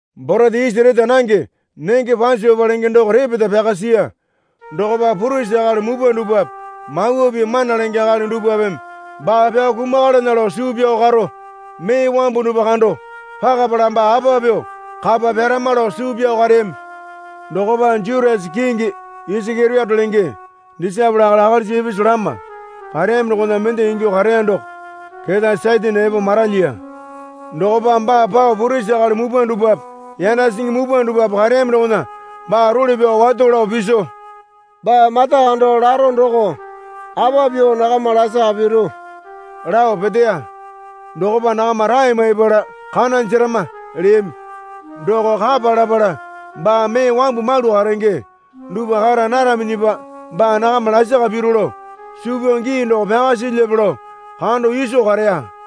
Borete isi reta nange nenge Pasopa lenge doko repeta pyaka siya. Dokopa purisi akali mupwa dupwape Mawa Pii mana lenge akali dupwapeme baa pyao kumakalana lao suu pyao karo mee wambu dupwa kando pakapala baa apa pyuo kapa pyarama lao suu pyao kareyami. Dokopa Jutasa kingi Isakeriote lenge disaepole akali akalisa ipisu lama kareyami dokona mende ingyuo kareya doko keta Satane epo maralyiya. Dokopa baa pao purisi akali mupwa dupwape yanda singi mupwa dupwape kareyami dokona baa role pyao wato lao piso, Baa mata kando laro doko apa pyuo nakama lasaka piru, lao peteya. Dokopa nakama rae maipala, Kana jerama, leyami. Doko kapa lapala baa mee wambu malu karenge dupwa kara naraminyipa baa nakama lasaka piru lao suu pyao gii doko pyaka silyape lao kando iso kareya.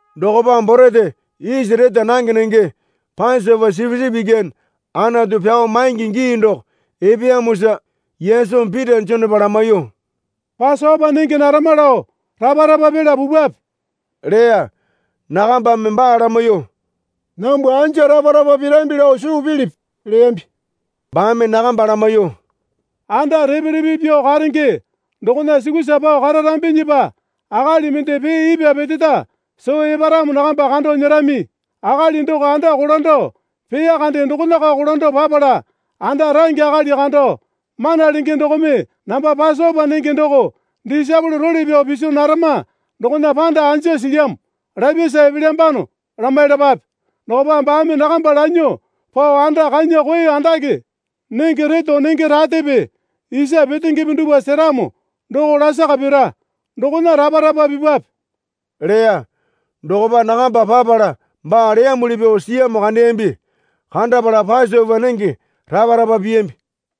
Dokopa borete isi reta nange nenge Pasopa sipisipi ikyane Anatu pyao maingi gii doko epeyamosa Yesumi Pita Jonepa lamaiyuo, Pasopa nenge narama lao rapa rapa pila pupwape leya. Nakambame baa lamaiyuo, Nambwa anja rapa rapa pirambi lao suu pilipi? leyambi. Baame nakamba lamaiyuo, Anda repe repe pyuo karenge dokona sukusa pao kararambinyipa akali mende pee ipwa peteta soo eparamo nakamba kando nyerami. Akali doko anda kolando peya kande dokonako kolando papala anda range akali kando, Mana Lenge dokome namba Pasopa nenge doko disaepole role pyao piso narama dokona panda anja silyamo? lapyasa epelyambano, lamailapape. Dokopa baame nakamba lanyuo pao anda kanya koe andake nenge reto nenge ratepe isa petengepe dupwa seramo doko lasaka pira. Dokona rapa rapa pipwape leya. Dokopa nakamba papala baa leyamuli pyuo siyamo kandeyambi. Kandapala Pasopa nenge rapa rapa piyambi.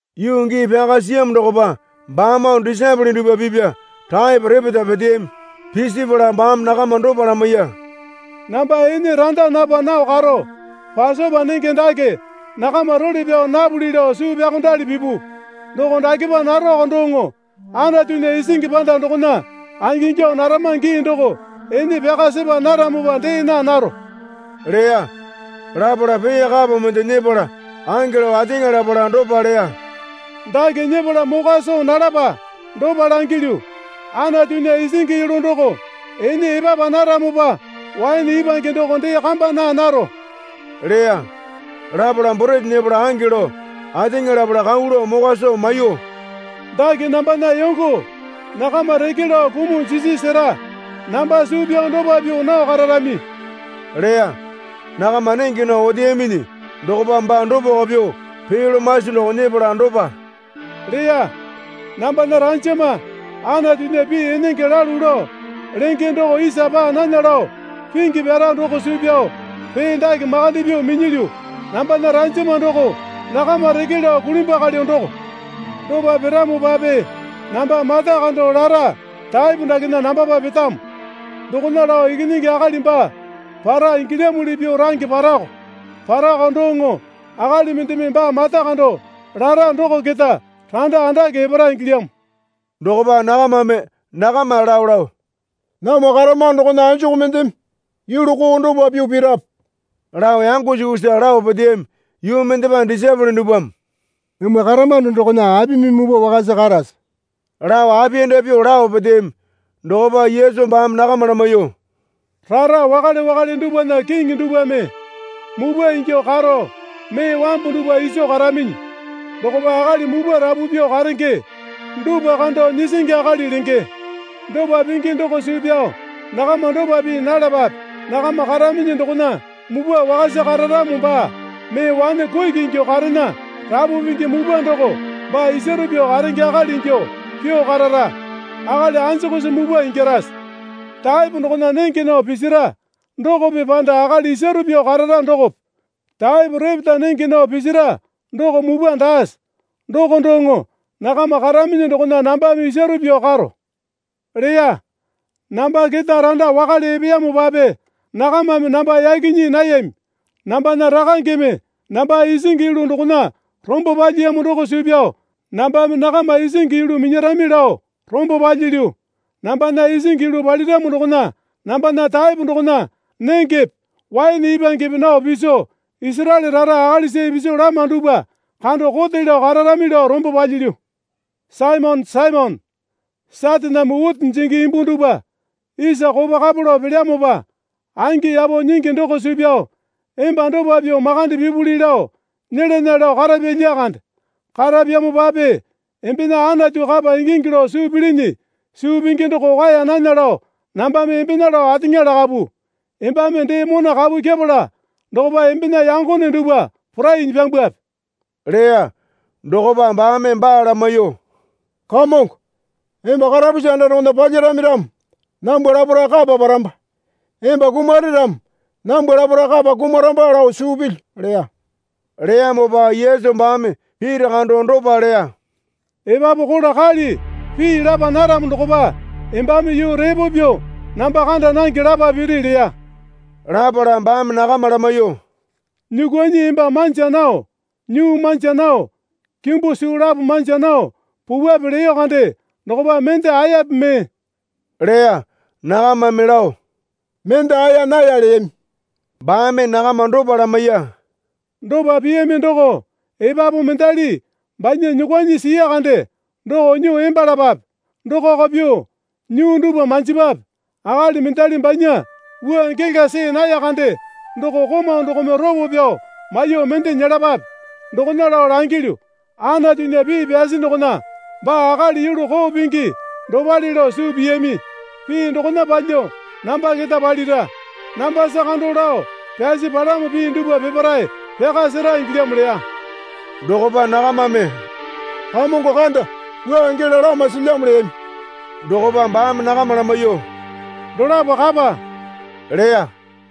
Yuu gii pyaka siyamo dokopa baamoo disaepole dupwa pipya taepo repeta peteyami. Pisipala baame nakama dopa lamaiya. Namba ene randa napa nao karo Pasopa nenge dake nakama role pyao napuli lao suu pyaokondali pipu. Doko dakepa naroko doŋo Anatunya isingi panda dokona angingyuo narama gii doko ene pyaka sepa naramopa dee naa naro leya. Lapala pee kapo mende nyepala ange lao ateŋa lapala dopa leya. Dake nyepala mokwa soo nalapa. Dopa langilyu, Anatunya isingi yulu doko ene epapa naramopa waene ipwange doko dee kamba naa naro leya. Lapala borete nyepala ange lao ateŋa lapala kau lao mokwa soo maiyuo, Dake nambana yongo (nakama reke lao kumuo jisi sera. Namba suu pyao dopa pyuo nao kararami leya. Nakama nenge nao oteyaminyi dokopa baa dopako pyuo pee lomasi doko nyepala dopa leya. Nambana ranjama Anatunya pii enenge lalu lao lenge doko isa paa nana lao pingi pyara doko suu pyao pee dake makande pyuo minyilyu. Nambana ranjama doko nakama reke lao kulimbwakalyo doko.) Dopa piramopape namba mata kando lara taepo dakena nambapa petamo. Dokona lao Ikinyingi Akali baa para ingilyamuli pyuo range parako. Parako doŋo akali mendeme baa mata kando lara doko keta randa andake epara ingilyamo. Dokopa nakamame nakama lao lao, Namwa karamano dokona anjuku mendeme yulu koo dopa pyuo pirape? lao yango sukusa lao peteyami. Yuu mendepa disaepole dupwame, Namwa karamano dokona apimi mupwa wakasa karase? lao apiyanda pyuo lao peteyami. Dokopa Yesu baame nakama lamaiyuo, Rara wakale wakale dupwana kiŋi dupwame mupwa ingyuo karo mee wambu dupwa iso karaminyi. Dokopa akali mupwa rapu pyuo karenge dupwa kando nyisingi akali lenge. Dopa pingi doko suu pyao nakama dopa pii nalapape. Nakama karaminyi dokona mupwa wakasa kararamo baa mee wane kuki ingyuo karena rapu pingi mupwa doko baa isaru pyuo karenge akali ingyuo pyuo karara. Akali anjukusi mupwa ingyarase? Taepo dokona nenge nao pisira dokope panda akali isaru pyuo karara dokope? Taepo repeta nenge nao pisira doko mupwa daase? Doko doŋo nakama karaminyi dokona nambame isaru pyuo karo leya. Namba keta randa wakale epeyamopape nakamame namba yaki nyii nayami. Nambana Rakangeme namba isingi yulu dokona rombo palyiyamo doko suu pyao nambame nakama isingi yulu minyarami lao rombo palyilyu. Nambana isingi yulu paliramo dokona nambana taepo dokona nengepe waene ipwangepe nao piso Isaraele rara akalisa ipisu lama dupwa kando kote lao kararami lao rombo palyilyu. Saimone, Saimone, Sataname witi jingi imbu dupwa isa kopo kapo lao pelyamopa angi yapo nyingi doko suu pyao emba dopa pyuo makande pipuli lao nyelana lao karapya lyakande. Karapyamopape embena Anatu kapa ingingi lao suu pilini suu pingi doko kwaeya nana lao nambame embena lao ateŋa lakapu. Embame dee mona kapu kyepala dokopa embena yangone dupwa porainyi pyambwape leya. Dokopa baame baa lamaiyuo, Kamongo, emba karapusi anda dokona palyarami ramo nambwa laparae kapa paramba. Emba kumare ramo nambwa laparae kapa kumaramba lao suu pilyu leya. Leyamopa Yesu baame Pita kando dopa leya. Epapu kola kali pii lapa naramo dokopa embame yuu repo pyuo namba kanda nange lapa piri leya. Lapala baame nakama lamaiyuo, Nyuukwuanyi emba manja nao nyuu manja nao kimbu suu lapo manja nao pupwape leyo kande dokopa mende aeyape mee? leya. Nakamame lao, Mende aeya naya leyami. Baame nakama dopa lamaiya. Dopa piyami doko epapu mendali banya nyuukwuanyi siya kande doko nyuo embalapape. Dokako pyuo nyuu dupwa manjipwape. Akali mendali banya wua gela see naya kande doko komau dokome ropo pyao maiyuo mende nyelapape. Dokona lao langilyu, Anatunya pii pyasi dokona, Baa akali yulu koo pingi dopale lao suu piyami, pii dokona palyuo namba keta palira. Nambasa kando lao pyasi palamo pii dupwa peparae pyaka sera ingilyamo leya. Dokopa nakamame, Kamongo kanda, wua gela lama silyamo leyami. Dokopa baame nakama lamaiyuo, Dolapo kapa leya.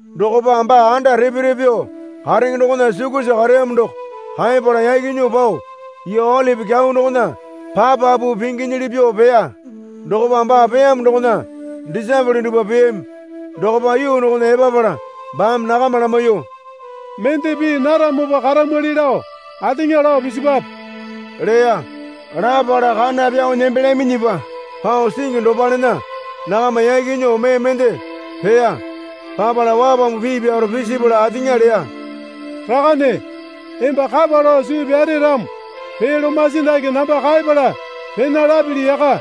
Dokopa baa anda repe repe pyuo karenge dokona sukusa kareyamo doko kaepala yaki nyuo pao yuu Olipi Kyau dokona papapu pinginyili pyuo peya. Dokopa baa peyamo dokona disaepole dupwa peyami. Dokopa yuu dokona epapala baame nakama lamaiyuo, Mendeme pii naramopa karamwali lao ateŋa lao pisipape leya. Lapala kana pyao nembelyaminyipa pao singi dopalena nakama yaki nyuo mee mende peya. Papala wapambu pii pyaro pisipala ateŋa leya. Rakane, emba kapa lao suu pyare ramo pee lomasi dake namba kaepala pena lapili yaka.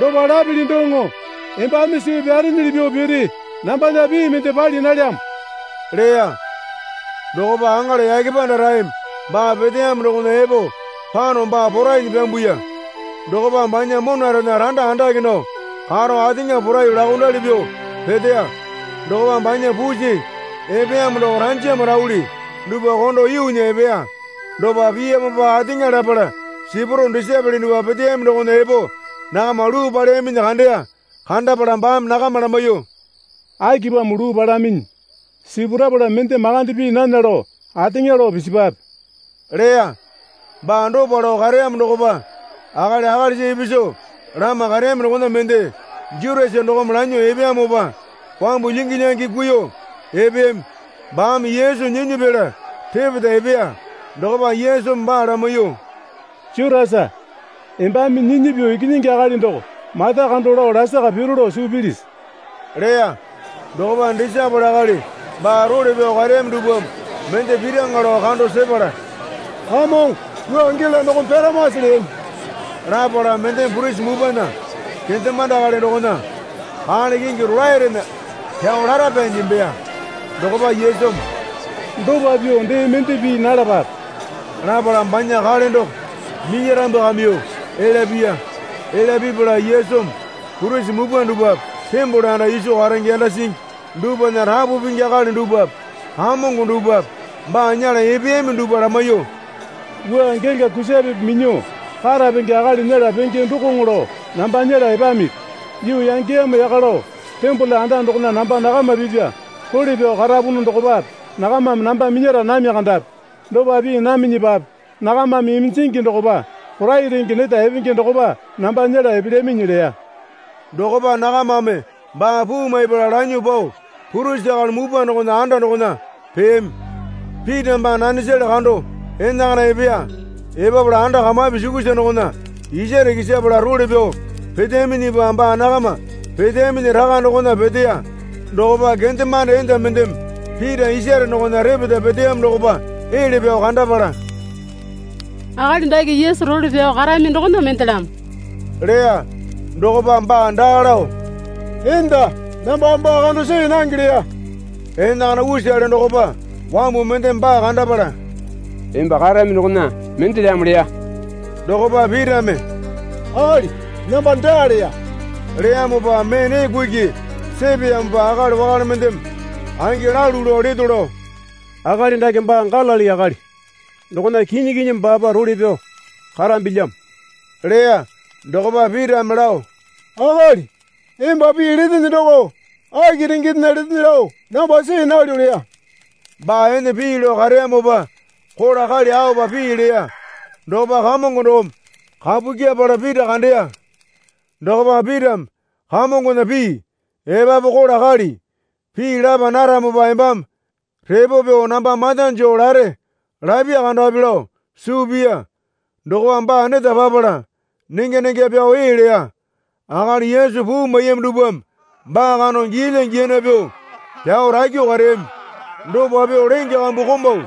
Dopa lapili doŋo embame suu pyarenyili pyuo piri nambana pii mende pali nalyamo leya. (Dokopa aŋala yake pandaraeme baa peteyamo dokona epo pano baa porainyi pyambuya. Dokopa banya monarena randa andake nao karo ateŋa poraiyuo laokondali pyuo peteya. Dokopa banya pusi epeyamo doko ranjama rauli dupwa kondo yuunya epeya.) Dopa piyamopa ateŋa lapala sipuro disaepole dupwa peteyami dokona epo nakama luu paleyaminyi kandeya. Kandapala baame nakama lamaiyuo, Akipamo luu palaminyi? Sipurapala mende makande pii nana lao ateŋa lao pisipape, leya. Baa dopa lao kareyamo dokopa akali akalisa ipisu lama kareyami dokona mende Jutasa dokome lanyuo epeyamopa wambu lyingi lyangi kuiyuo epeyami. Baame Yesu nyinyi pela repeta epeya. Dokopa Yesumi baa lamaiyuo, Jutasa, embame nyinyi pyuo Ikinyingi Akali doko mata kando lao lasaka piru lao suu pilisi? leya. Dokopa disaepole akali baa role pyao kareyami dupwame mende piraŋa lao kando sepala, Kamongo wua gela dokome pyaramase? leyami. Lapala mendeme purisi mupwana kendemande akali dokona kale kingi rolaerena pyao lara pyanyi nembeya. Dokopa Yesumi, Dopa pyuo dee mende pii nalapape, lapala banya kale doko minyarambwakamyuo elya piya. Elya pipala Yesumi purisi mupwa dupwape tembole anda iso karenge yanda singi dupwana rapu pingi akali dupwape kamongo dupwape baa nyela epeyami dupwa lamaiyuo, Wua gela kusapepe minyuo karapenge akali nyela penge dokoŋo lao namba nyela epamipi? Yuu yangeyamo yaka lao tembole anda dokona namba nakama pipya role pyao karapunu dokopape nakamame namba minyara nami kandapi. Dopa pii naminyipape nakamame iminjingi dokopa porai renge neta epenge dokopa namba nyela epelyaminyi leya. Dokopa nakamame baa puu maipala lanyuo pao purisi akali mupwa dokona anda dokona peyami. Pita baa nanesale kando enakana epeya. Epapala anda kamapi sukusa dokona isare kisapala role pyao peteyaminyipa baa nakama peteyaminyi raka dokona peteya. Dokopa kendemande enda mendeme Pita isare dokona repeta peteyamo dokopa ele pyao kandapala, Akali dake Yesu role pyao karami dokona mendelamo leya. Dokopa baa daa lao, Enda, nambame baa kando see nange leya. Enakana usale dokopa wambu mendeme baa kandapala, Emba karami dokona mendelamo leya. Dokopa Pitame, Akali, namba daa leya. Leyamopa mee nee kuki sepeyamopa akali wakale mendeme, Angi lalu lao leto lao, akali dake baa Galili akali dokona kinyi kinyi baapa role pyao karambilyamo leya. Dokopa Pitame lao, Akali, emba pii letene doko aki rengendena letene lao namba see nalyo leya. Baa ene pii lao kareyamopa kola kali aopa pii leya. Dokopa Kamongo dokome kapu kyepala Pita kandeya. Dokopa Pitame Kamongona pii, Epapu kola kali pii lapa naramopa embame repo pyuo namba mata joo lare, lapya kandapi lao suu piya. Dokopa baa neta papala nengya nengya pyao ee leya. Akali Yesu puu maiyami dupwame baa kando giyalya giyana pyuo pyao rakyuo kareyami. Dopa pyuo lenge kambu komau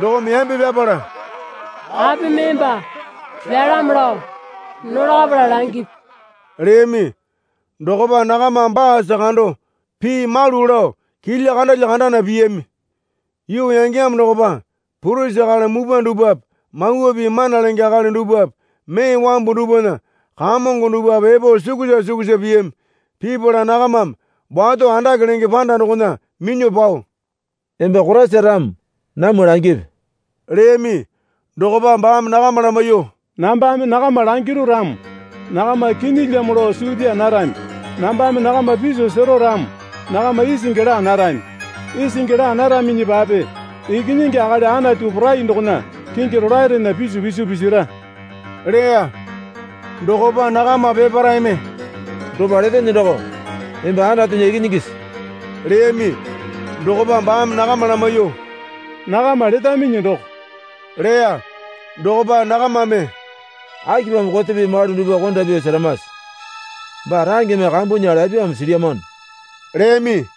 dokome yambe pyapala, Apimi emba pyalamo lao nolakapala langipi? leyami. Dokopa nakamame baasa kando pii malu lao kilya kandalya kandana piyami. Yuu yangeyamo dokopa purisi akali mupwa dupwape Mawa Pii mana lenge akali dupwape mee wambu dupwana kamongo dupwape epo sukusa suksua piyami. Pipala nakamame wato andake lenge panda dokona minyuo pao, Emba Koraisa ramo namwa langipi leyami. Dokopa baame nakama lamaiyuo, Nambame nakama langiru ramo nakama kinyilyamo lao suu pyaa narami. Nambame nakama piso sero ramo nakama isingi laa narami. Isingi laa naraminyipape Ikinyingi Akali Anatu Porai dokona kingi rolaerena pisu piso pisira leya. Dokopa nakama peparaeme, Dopa letene doko emba Anatunya Ikinyingisi? leyami. Dokopa baame nakama lamaiyuo, Nakama letaminyi doko leya. Dokopa nakamame, Akipamo kote pii malu dupwa konda pyuo seramase? Baa rangeme kambunya lapyamo silyamano leyami.